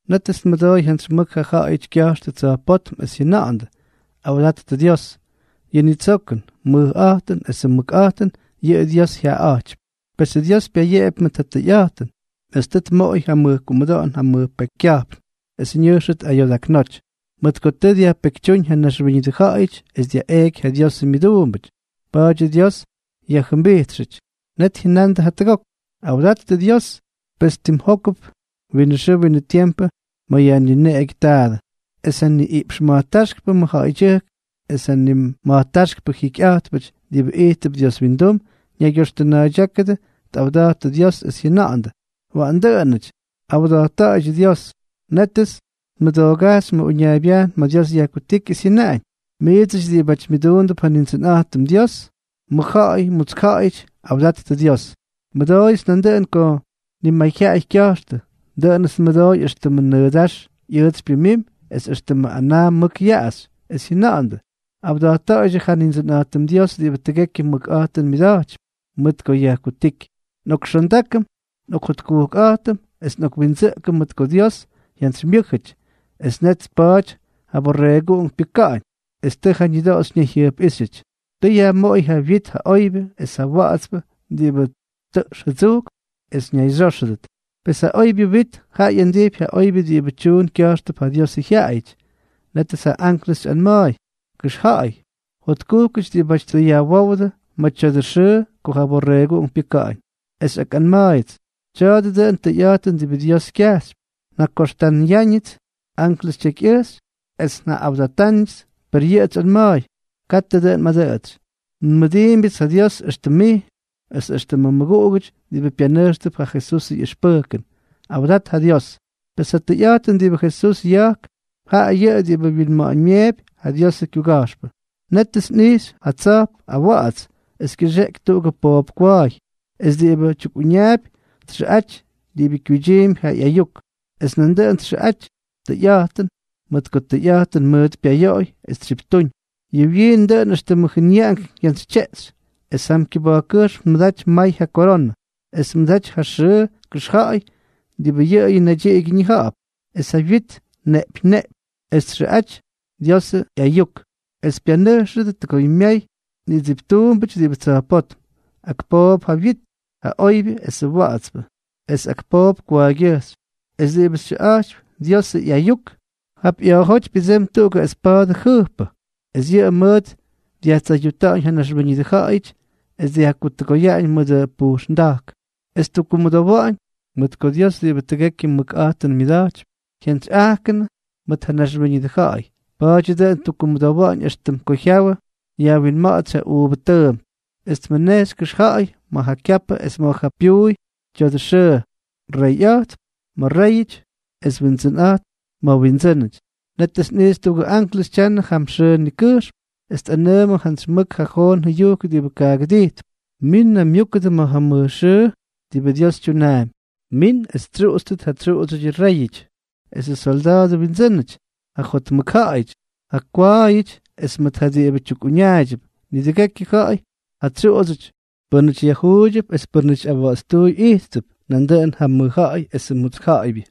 Nétʉts nmʉdooy jantsy mʉk ja ja̱ꞌa̱yʉty kya̱jxtʉ tsa̱jpótm, es jyʉna̱ꞌa̱ndʉ: ¡Awdattʉ Dios! Yʉ nitsokʉn, mʉjꞌa̱jtʉn esʉ mʉkꞌa̱jtʉn, yʉꞌʉ Dios jyaꞌaꞌa̱jtypy. Pesʉ Dios payeꞌepy mʉt ja tʉyꞌa̱jtʉn, es tʉ tmoꞌoy ja kumʉdoꞌon ja mʉj pekykya̱jpn es ñʉjxʉt ayodaknoty. Mʉt ko tʉ dyajpekytyúñ ja naxwíñʉdʉ ja̱ꞌa̱yʉty es dyaꞌeꞌky ja Diosʉ myʉduumbʉty, pa̱a̱dyʉ Dios yajʉmbijtxʉty. Net jyʉnandʉ jatʉgok: —Awdattʉ Dios. Pes timjókʉp winʉ xʉʉ winʉ tiempʉ ma̱ yajnineꞌegyʉ taadʉ. Es ja niꞌiꞌpx ma̱jtáxkpʉ mʉjja̱ꞌa̱ydyʉjk es ja nima̱jtáxkpʉ jikyꞌa̱jtpʉty diꞌibʉ ijttʉp Dios windum, ñaygyoxtʉna̱a̱ydyákʉdʉ, tꞌawda̱jttʉ Dios es jyʉna̱ꞌa̱ndʉ: —Waꞌan dʉꞌʉnʉty. ¡Awda̱jtta̱ꞌa̱ydyʉ Dios! Nétʉts nmʉdoogajxy ma̱ uñaaybyajn ma̱ Dios yajkutíky, es jyʉnaꞌañ: Miidsʉty diꞌibáty myʉduundʉp ja Nindsʉnꞌa̱jtʉm Dios, mʉjja̱ꞌa̱y mutsk ja̱ꞌa̱yʉty, awdattʉ Dios. Nmʉdooyʉts nandʉꞌʉn ko nimayjyaꞌay kya̱jxtʉ, dʉꞌʉnʉts nmʉdooy éxtʉmʉ nʉʉdáx ꞌyʉʉtsy pyʉmimy, es éxtʉmʉ anaa mʉk yaꞌaxy, es jyʉna̱ꞌa̱ndʉ: Awda̱jtta̱ꞌa̱ydyʉ ja Nindsʉnꞌa̱jtʉm Dios diꞌibʉ tʉgekyʉ mʉkꞌa̱jtʉn myʉda̱jtypy, mʉt ko yajkutíky. Nꞌokxondákʉm, nꞌokjotkujkʉm es nꞌokwindsʉꞌkʉm, mʉt ko Dios jyantsymyʉ́jʉty es tʉ net tpa̱a̱ty ma̱ ja Borreeguꞌunk pyʉka̱ꞌa̱ñ, es tʉ ja ñʉdoꞌoxy ñayjyʉjpꞌíxyʉty. Tʉ yajmoꞌoy ja wit ja oybyʉ es ja wa̱ꞌa̱tspʉ diꞌibʉ tʉꞌx jʉdsujkp, es ñayxyóxʉdʉt. Pes ja oybyʉ wit jaꞌa ꞌyandijpy ja oybyʉ diꞌibʉ tyuun kya̱jxtʉp ja Diosʉ jyaꞌayʉty. Nétʉts ja anklʉs xyꞌanma̱a̱y: —Kʉxja̱ꞌa̱y: “Jotkujkʉty diꞌibáty tʉ yajwówdʉ ma̱ tya̱dʉ xʉʉ ko ja Borreeguꞌunk pyʉka̱ꞌa̱ñ.” Es xyꞌakꞌanma̱a̱yʉts: —Tya̱a̱dʉ dʉꞌʉn tʉyꞌa̱jtʉn diꞌibʉ Dios kyajxypy. Njakoxtanʉyáñʉts anklʉs tyekyꞌʉjxy, es njaꞌꞌawdatáñʉts, per yʉꞌʉts xyꞌanma̱a̱y: —Katʉ dʉꞌʉn mꞌadʉꞌʉtsy. Nmʉdiimbyʉts ja Dios éxtʉm mij, es éxtʉmʉ mmʉguꞌugʉty diꞌibʉ pyanʉjxtʉp ja Jesusʉ ꞌyʉxpʉjkʉn. Awdat ja Dios. Pes ja tʉyꞌa̱jtʉn diꞌibʉ Jesús ya̱jk, jaꞌa yʉꞌʉ diꞌibʉ wyinma̱ꞌa̱ñmyeepy ja Diosʉ kyuga̱jxpʉ. Nétʉts nꞌijxy ja tsa̱jp awa̱ꞌa̱ts, es kyʉxeꞌeky tuꞌugʉ poop kwa̱a̱y. Es diꞌibʉ tyukꞌuñaapy txʉꞌaty Diꞌibʉ Kyuydyiimpy Ja ꞌYayuk, es nandʉꞌʉn txʉꞌaty Tʉyꞌa̱jtʉn, mʉt ko tʉyꞌa̱jtʉn mʉʉt pyayoꞌoy es tsyiptúñ. Yʉ wyiin dʉꞌʉn éxtʉmʉ jʉnyaꞌank jyantsytyeꞌxy, es jam kyʉba̱jkkʉjxm tmʉdaty may ja koronʉ. Es tmʉdaty ja xyʉʉ kʉxja̱ꞌa̱y diꞌibʉ yʉꞌʉyʉ naydyiꞌigyʉ ñija̱ꞌa̱p. Es ja wyit neꞌpyñ neꞌpyñ. Es txʉꞌaty Diosʉ ꞌyAyuk. Es pyanʉjxʉdʉ tʉgoymyay nidsiptuumbʉty diꞌibʉ tsa̱jpótm. Ak poop ja wyit, ja oybyʉ esʉ wa̱ꞌa̱tspʉ, es ak poop kwa̱a̱ygyʉjxy. Es diꞌibʉ xyʉꞌa̱jtypy Diosʉ ꞌyAyuk, jap ꞌya̱a̱jóty pyʉdsemy tuꞌugʉ espa̱a̱dʉ jʉjppʉ, es yʉꞌʉ mʉʉt dyajtsayuta̱ꞌa̱ñ ja naxwíñʉdʉ ja̱ꞌa̱yʉty. Es yajkutuka̱ꞌa̱ñ mʉdʉ pujxnda̱jk. Es ttukkumʉdowa̱ꞌa̱ñ, mʉt ko Dios diꞌibʉ tʉgekyʉ mʉkꞌa̱jtʉn myʉda̱jtypy, jyantsyꞌajkʉnʉ mʉt ja naxwíñʉdʉ ja̱ꞌa̱y. Pa̱a̱dyʉ dʉꞌʉn ttukkumʉdowa̱ꞌa̱ñ éxtʉm ko jyawʉ yajwinma̱ꞌa̱tsy ja uuvʉ tʉʉmp. Es tmʉnejxy kʉxja̱ꞌa̱y ma̱ ja kyapʉ es ma̱ ja pyuuy tya̱dʉ xʉʉ: “Reyꞌa̱jtp ma̱ réyʉty es Windsʉnꞌa̱jtp ma̱ windsʉ́nʉty.” Nétʉts nꞌijxy tuꞌugʉ anklʉs tyanʉ jam xʉʉ ñikʉjxm es tꞌanʉʉmʉdʉ jantsy mʉk ja joon jʉyujk diꞌibʉ kaꞌagʉdijtp: —¡Min naymyúkʉdʉ ma̱ ja mʉj xʉʉ diꞌibʉ Dios tyunaampy! Min es xytsyuꞌutstʉt ja tsyuꞌudsyʉdyʉ réyʉty esʉ solda̱a̱dʉ windsʉ́nʉty, ja jotmʉk ja̱ꞌa̱yʉty, ja kwa̱a̱yʉty es mʉt ja diꞌibʉ tukꞌuñaayʉdʉp, nidʉgekyʉ ja̱ꞌa̱y ja tsyuꞌudsyʉty, pʉ́nʉty yajjuuydyʉp es pʉ́nʉty awa̱ꞌa̱tstuuy ijttʉp, nandʉꞌʉn ja mʉj ja̱ꞌa̱y mutsk ja̱ꞌa̱ybyʉ.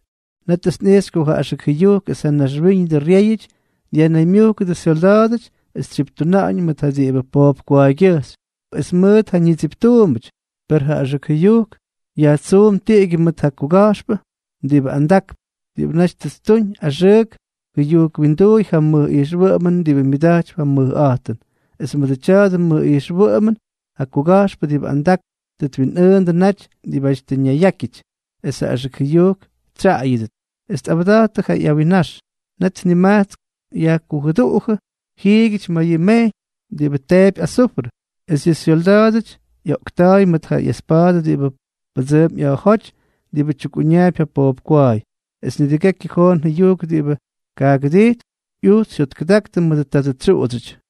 Nétʉts nꞌijxy ko ja axʉk jʉyujk es ja naxwíñʉdʉ ryéyʉty dyajnaymyúkʉdʉ syolda̱a̱dʉty es tsyiptuna̱ꞌa̱ñ mʉt ja diꞌibʉ poop kwa̱a̱ygyʉjxy es mʉt ja ñidsiptuumbʉty. Per ja axʉk jʉyujk yajtsuum tiꞌigyʉ mʉt ja kuga̱jxpʉ diꞌibʉ andakp, diꞌibʉ naty tʉ ttuñ axʉk jʉyujk wyinduuy ja mʉj ijxwʉꞌʉmʉn diꞌibʉ myʉda̱jtypy ja mʉjꞌa̱jtʉn. Es mʉdʉ tya̱dʉ mʉj ijxwʉꞌʉmʉn ja kuga̱jxpʉ diꞌibʉ andakp tʉ twinꞌʉʉndʉ naty diꞌibáty tʉ ñayyákyʉty es ja axʉk jʉyujk tsyaꞌayʉdʉt, es tꞌawda̱jttʉ ja ꞌyawinnax. Net nimajtsk yajkujʉduꞌujʉ jiigyʉty ma̱ yʉ mejyñ diꞌibʉ teepy azufrʉ. Es yʉ syolda̱a̱dʉty yaꞌoꞌkta̱a̱y mʉt ja ꞌyespa̱a̱dʉ diꞌibʉ pʉdsʉʉmp ꞌya̱a̱jóty diꞌibʉ tyukꞌuñaapy ja poop kwa̱a̱y. Es nidʉgekyʉ joon jʉyujk diꞌibʉ kaꞌagʉdijtp ꞌyujts jyotkʉdaktʉ mʉdʉ tadʉ tsyuꞌudsyʉty.